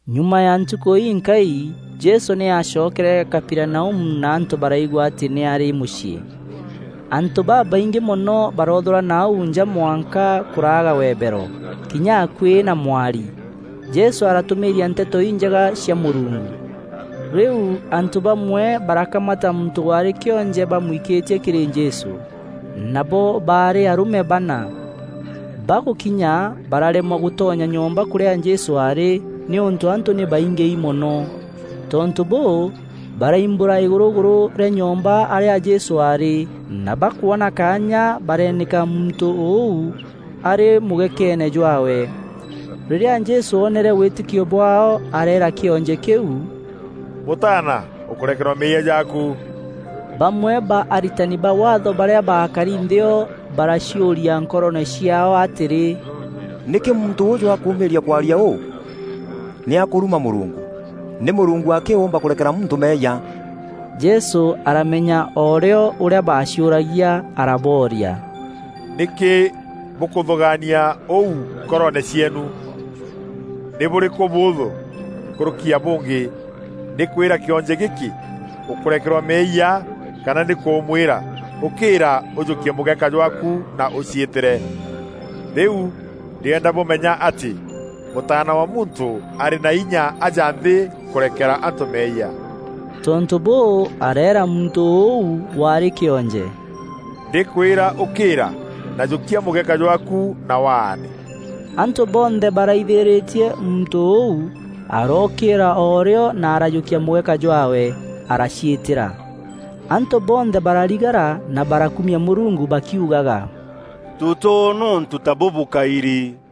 Nyuma ya ntukû inkai, Jesû nî aacokere Kaperinaumu na antû baraigua atî nî aarî mûciî. Antû babaingî mono baroothûrana au nja mwanka kûraaga webero kinya akuî na mwari. Jesû aratûmîîria Nteto Injega cia Mûrungu. Rîu antû bamwe barakamata muntû waarî kîonje bamwikîtie kîrî Jesû. Nabo baarî arûme bana. Bagûkinya, bararemwa gûtonya nyomba kûrîa Jesû aarî nîûntû antû nî baingîi mono. Tontû bûû, baraimbûra îgûrûgûrû rîa nyomba arîa Jesû aarî na bakwona kaanya bareenîka muntû ûu arî mûgekeene jwaawe. Rîrîa Jesû oonere wîtîkio bwaao, areera kîonje kîu, “Mûtaana, ûkûrekerwa meeyia jaaku.” Bamwe ba aritani ba Waatho barîa baakari nthî o, baraciûria nkoroone ciaao atîrî, “Nîkî muntû ûûjû akûûmîîria kwaria ûu? Nî akûruma Mûrungu! Nî Mûrungu akî ûûmba kûrekera muntû meeyia.” Jesû aramenya o rîo ûrîa baaciûragia arabooria, “Nîkî bûkûthûgaania ûu nkoroone cieenu? Nî bûrîkû bûûthû nkûrûki ya bûngî; nî kwîra kîonje gîkî ‘Ûkûrekerwa meeyia,’ kana nî kûmwîra, ‘Ûkîîra ûjûkie mûgeka jwaaku na ûcîîtîre?’ Rîu ndîenda bûmenya atî Mûtaana wa Muntû arî na inya aja nthî kûrekera antû meeyia.” Tontû bûû, areera muntû ûu waarî kîonje, “Ndîkwîra, ûkîîra, na jûkia mûgeka jwaaku na waane!” Antû bonthe baraithîrîtie, muntû ûu arookîîra o rîo na arajûkia mûgeka jwaawe, araciîtîra. Antû bonthe bararigara na barakumia Mûrungu, bakiugaga, “Tûtoona ûntû ta bûbû kaîrî.”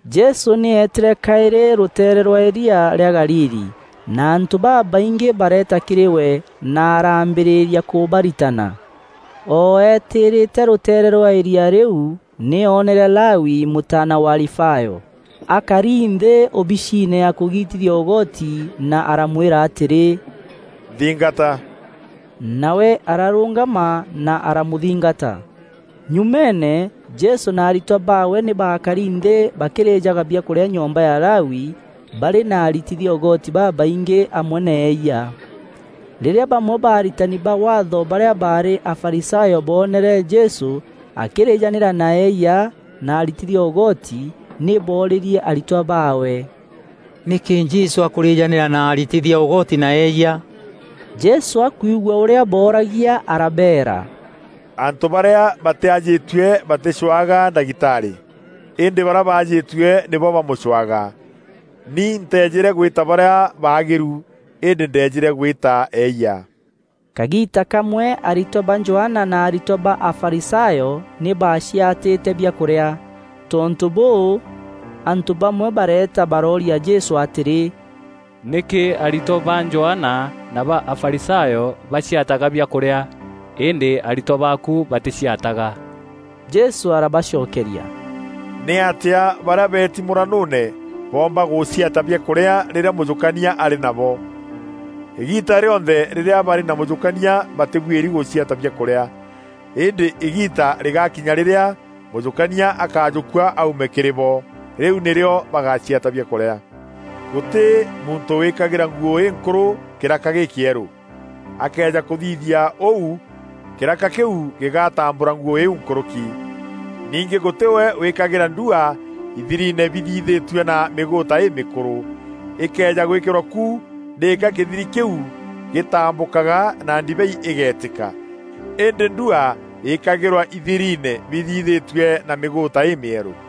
Jesû nî eetîre kaîrî rûteere rwa îria rîa Galili na antû babaingî bareeta kîrî we na araambîrîria kûbaritana. O eetîrîte rûteere rwa îria rîu, nî oonere Lawi, mûtaana wa Alifayo, akari nthî ûbiciine ya kûgitithia ûgoti na aramwîra atîrî, “Nthingata!” Nawe ararûngama na aramûthingata. Nyumeene, Jesû na aritwa baawe nî baakari nthî bakîrîjaga biakûrîa nyomba ya Lawi barî na aritithia ûgoti babaingî amwe na eeyia. Rîrîa bamwe ba aritani ba Waatho barîa baarî Afarisayo boonere Jesû akîrîjanîra na eeyia na aritithia ûgoti, nî boorîrie aritwa baawe, “Nîkî Jesû akûrîjanîra na aritithia ûgoti na eeyia?” Jesû akwigua ûrîa booragia arabeera, “Antû barîa batîajîtue batîcûaga ndagitarî, îndî barîa baajîtue nîbo bamûcûaga. Ni nteejîre gwîta barîa baagîru îndî ndeejîre gwîta eeyia.” Kagiita kamwe aritwa ba Johana na aritwa ba Afarisayo nî baaciatîte biakûrîa. Tontû bûû, antû bamwe bareeta barooria Jesû atîrî, “Nîkî aritwa ba Johana na ba Afarisayo baciataga biakûrîa, îndî aritwa baaku batîciataga?” Jesû arabacokeria, “Nîatîa barîa beeti mûranûûne boomba gûciata biakûrîa rîrîa mûjûkania arî nabo? Îgiita rîonthe rîrîa barî na mûjûkania batîbuîri gûciata biakûrîa. Îndî îgiita rîgakinya rîrîa mûjûkania akajûkua aume kîrî bo. Rîu nîrîo bagaciata biakûrîa. “Gûtî muntû wîkagîra nguû înkûrû kîraka gîkîerû. Akëeja kûthithia ûu, kîraka kîu gîgatambûra nguû îîu nkûrûki. Ningî gûtî we wîkagîra ndua ithiriine bithithîtue na mîgûûta îmîkûrû. Îkëeja gwîkîrwa ku, nîka kîthiri kîu gîtambûkaga na ndibei îgeetîka. Îndî ndua îkagîrwa ithiriine bithithîtue na mîgûûta îmîerû.”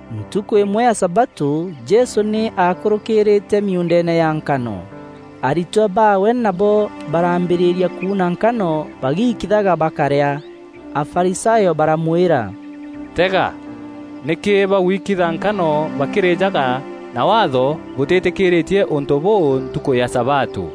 Ntukû îmwe ya sabatû Jesû nî aakûrûkîrîîte miuundeene ya nkano. Aritwa baawe nabo baraambîrîria kuuna nkano bagiikithaga bakarîa. Afarisayo baramwîra, “Tega! Nîkî baguikitha nkano bakîrîjaga na Waatho bûtîtîkîîrîtie ûntû bûu ntukû ya sabatû?”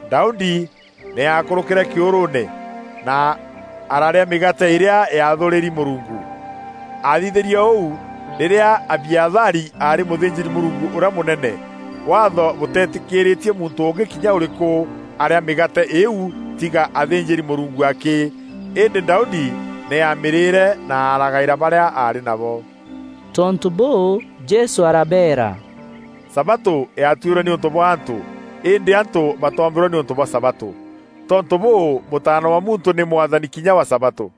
Daudi nî aakûrûkîre kîûrûûne na ararîa mîgaate îrîa yaathûrîri Mûrungu. Aathithîrie ûu rîrîa Abiathari aarî mûthînjîri-Mûrungu ûrîa mûnene. Waatho bûteetîkîîrîtie muntû ûngî kinya ûrîkû arîa mîgaate îîu, tîga athînjîri-Mûrungu akî. Îndî Daudi nî aamîrîîre na aragaîra barîa aarî nabo.” Tontû bûû, Jesû arabeera, “Sabatû yaatuîrwe nîûntû bwa antû îndî antû batoombîrwe nîûntû bwa sabatû. Tontû bûû, Mûtaana wa Muntû nî Mwathani kinya wa sabatû.”